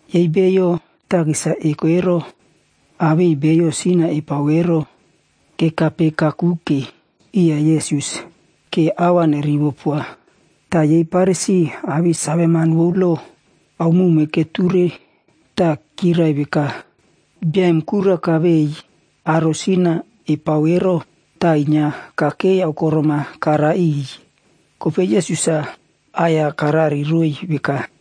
Yei beiyo takis-a eko ero awei beiyo sin-a epao ero, kekape kakuke iya Yesus ke a va nerivopoa. Ta yei Farisi awei saveman vou lo aomowme keture ta kyirai veka, “Bia em kura kavei aro sin-a epao ero ta inyia kakei aokorom-a kara iꞌiy.” Kopei Yesus-a aꞌai-ya karariroiy veka,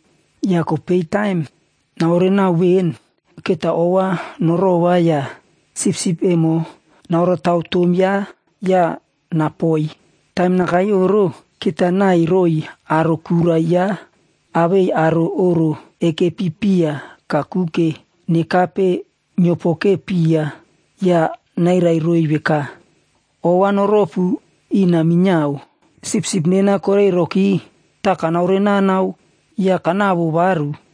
Ya kopei taim naorenao ven, keta ova norova ya sipsip emo naorataw tom yaꞌa ya napoi. Taim nakai oꞌro, keta naiy roiy aro kura yaꞌa awei aro oꞌro ekepi piya kakuke nekape nyiopoke piya ya nairai roiy veka, ‘Ova noropu ina minyiao, sipsip nena koreiroki ta kanaoreꞌnanao ya kanavo varu.’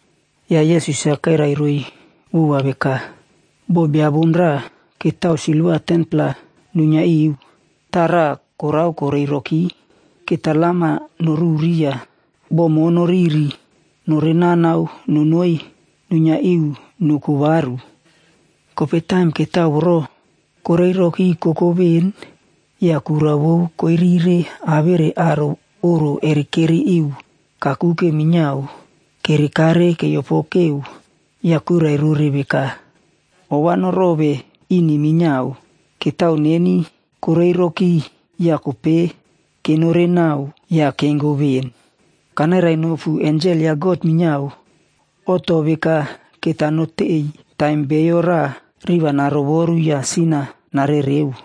Ya Yesus-a kairai roiy vova veka, “Bo bia bom raꞌa ketao silva 10-pla nuinyia iu, ta raꞌa korao koreiroki. Keta lam-a noruri ya bo mo noriri norenao nonoi nuinyia iu noko varu. Kopei taim ketao voro koreiroki koko ven, ya kura vou koirire awere aro oꞌro erekeri iu kakuke minyiao kerekare kereopokeo ya kuirai rore veka, ‘Ova norove ini minyiao, ketao neni koreiroki ya kopei kenorenao ya kengo ven.’ Kanairainopu, ensel ya God minyiao oꞌto veka keta notei taim bio raꞌa riꞌi va narovoru ya sin-a narereo.”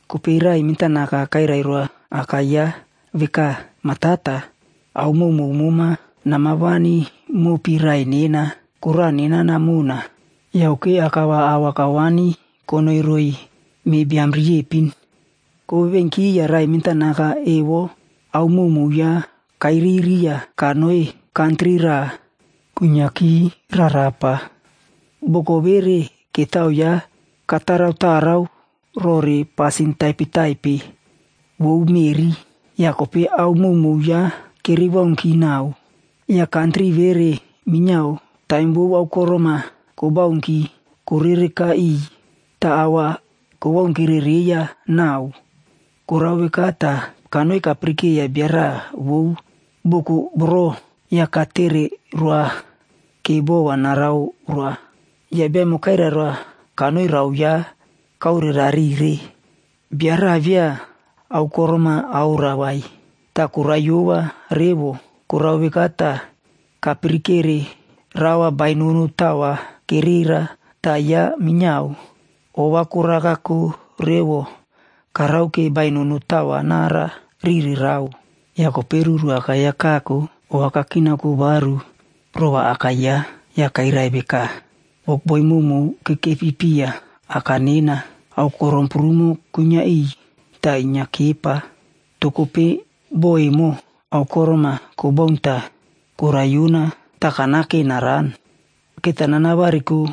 Kopei raꞌai mentanaka kairai roa aka yaꞌa veka, ‘Ma Tata, ao mowmow mema nama wani mopi raꞌai nena. Koraꞌa nena namona.’ Yauke aka va ao va kawani konoi roiy meꞌe biam riepin. “Kovevenki, ya raꞌai mentanaka evo ao mowmow yaꞌa kairiri ya kanoi kantri raꞌa kuinyiaki rarapa. Boko vere, ketao yaꞌa kataraꞌtarao rore pasin taipetaipe vou meꞌri. Ya kopei ao mowmow yaꞌa kere waunki nau, ya kantri vere minyiao taim vou aokorom-a kowaunki korereka iꞌiy ta a va kowaunki reiya nau. Korao veka ta kanoi kapirikeiya bia raꞌa vou boko voro ya katere roa ke bo va naraoroa. Ya bia emo kairai roa kanoi rao yaꞌa kaorerarire. Bia raꞌa via aokorom-a aoroa vai, ta koraiyova revo. Korao veka ta kapirikere rao va bainono tao va kerera, ta yaꞌa minyiao ova korakako revo karake bainono tao va nara rire rao. “Ya kopei ruru akai-ya kako ya ova kakinaoko varu rova aka yaꞌa, ya kairai veka, ‘Wokboi mowmow kekepi piya aka nena, aokorom prumo kuinyia iꞌiy ta inyia kepa. To kopei bo emo, aokorom-a kowaun ta koraiyona ta kanake naran. Keta nanavariko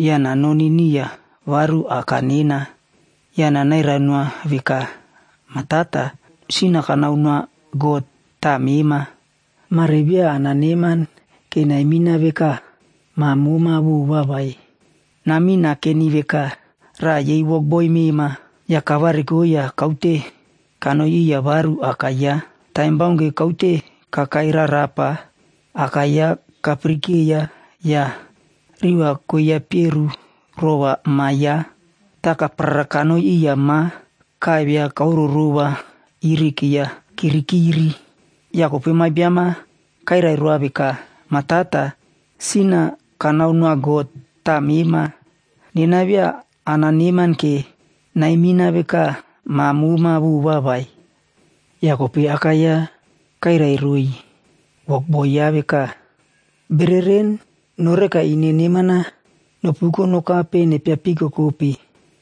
ya nanoni niya varu aka nena, ya nanairai noa veka, “Ma Tata, sin-a kanao noa God ta mema. Mare via ananeman ke naimina veka ma moma vova vai. Namin nakeni veka raꞌa yei wokboi mema.” ’ Ya kavariko ya kaute kanoi iya varu aka yaꞌa. “Taim baunke kaute kakai rarapa, aka yaꞌa kapirikeiya ya riꞌi koiya eperu rova ma yaꞌa. Ta kaparara kanoi iya ma kaivia kaororova iri keiya kirikiri. “Ya kopei ma biam-a kairai roa veka, ‘Ma Tata, sin-a kanao noa God ta mema. Nena via ananeman ke naimina veka ma moma vova vai.’ “Ya kopei aka yaꞌa kairai roiy wokboi yaꞌa veka, ‘Bereren, noreka ine neman-a nopuko nokape nepia pikokope.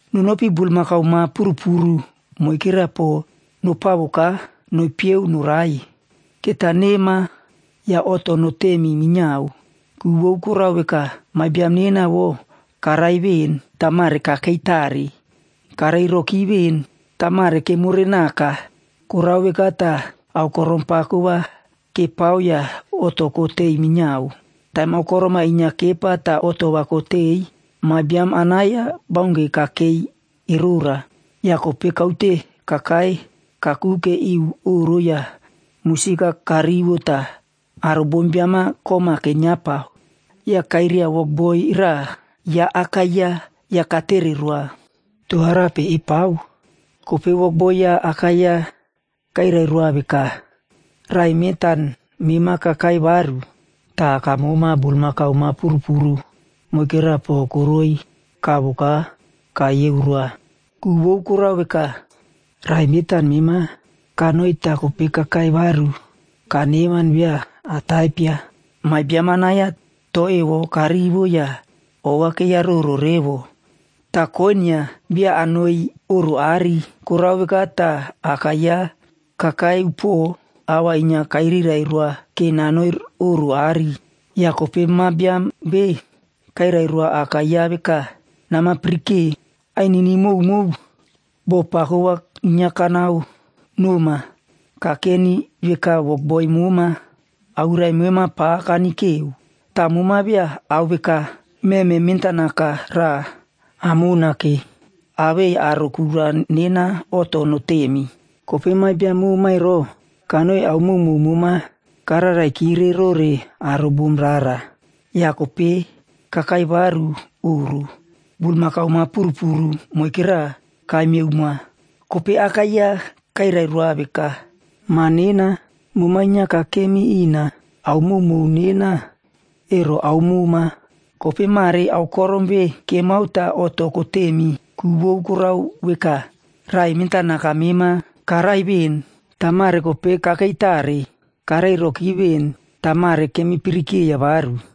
Nonopi bulmakau ma purupuru moikera po nopavoka nopyeu norai. Keta nema ya oꞌto notemi minyiao. Ku vou korao veka, ma biam nena voꞌo karai ven ta mare kakei tare. Karei roki ven ta mare kemorenaka.’ Korao veka ta aokorom pako va kepao ya oꞌto kotei minyiao. “Taim aokorom-a inyia kepa ta oꞌto va kotei, ma biam anai-ya baunke kakei erora. Ya kopei kaute kakai kakuke iu oꞌro ya musik-a karivo ta aro bombiam-a kom-a kenyiapa. Ya kairia wokboi raꞌa ya aka yaꞌa ya katere roa, ‘To arape epao?’ Kopei wokboi ya aka yaꞌa kairai roa veka, ‘Raꞌai mentan mema kakai varu. Ta aka moma bulmakau ma purupuru moikera po koroi kavoka kayeu roa. Ku vou korao veka, raꞌai mentan mema kanoi ta kopei kakai varu kaneman via ataipia.’ “Ma biam anai-ya to evo karivo ya ova keiyaroro revo, ta koinyia via nanoi oꞌro aꞌari. Korao veka ta aka yaꞌa kakai upuo a va inyia kairirai roa ke nanoi oꞌro aꞌari. Ya kopei ma biam ve kairai roa aka yaꞌa veka, ‘Nama pirike! Ainini mowmow, bo pako va inyia kanaonoma kakeni veka wokboi moma. Awirai mema pa kanikeo. Ta moma via ao veka meme mentanaka raꞌa amona ke awei aro kura nena oꞌto notemi. Kopei ma biam mema ero, kanoi ao mowmow mema kararai kire rore aro bom rara. Ya kopei kakai varu oꞌro, bulmakau ma purupuru moikera kaimyeu moa.’ “Kopei aka yaꞌa kairai roa veka, ‘Ma nena, moma inyia kakem ina, ao mowmow nena, ero ao moma. Kopei mare aokorom ve kemao ta oꞌto kotemi, ku vou korao veka, raꞌai mentanaka mema karai ven ta mare kopei kakei tare. Karei roki ven ta mare kemi pirikeiya varu.’”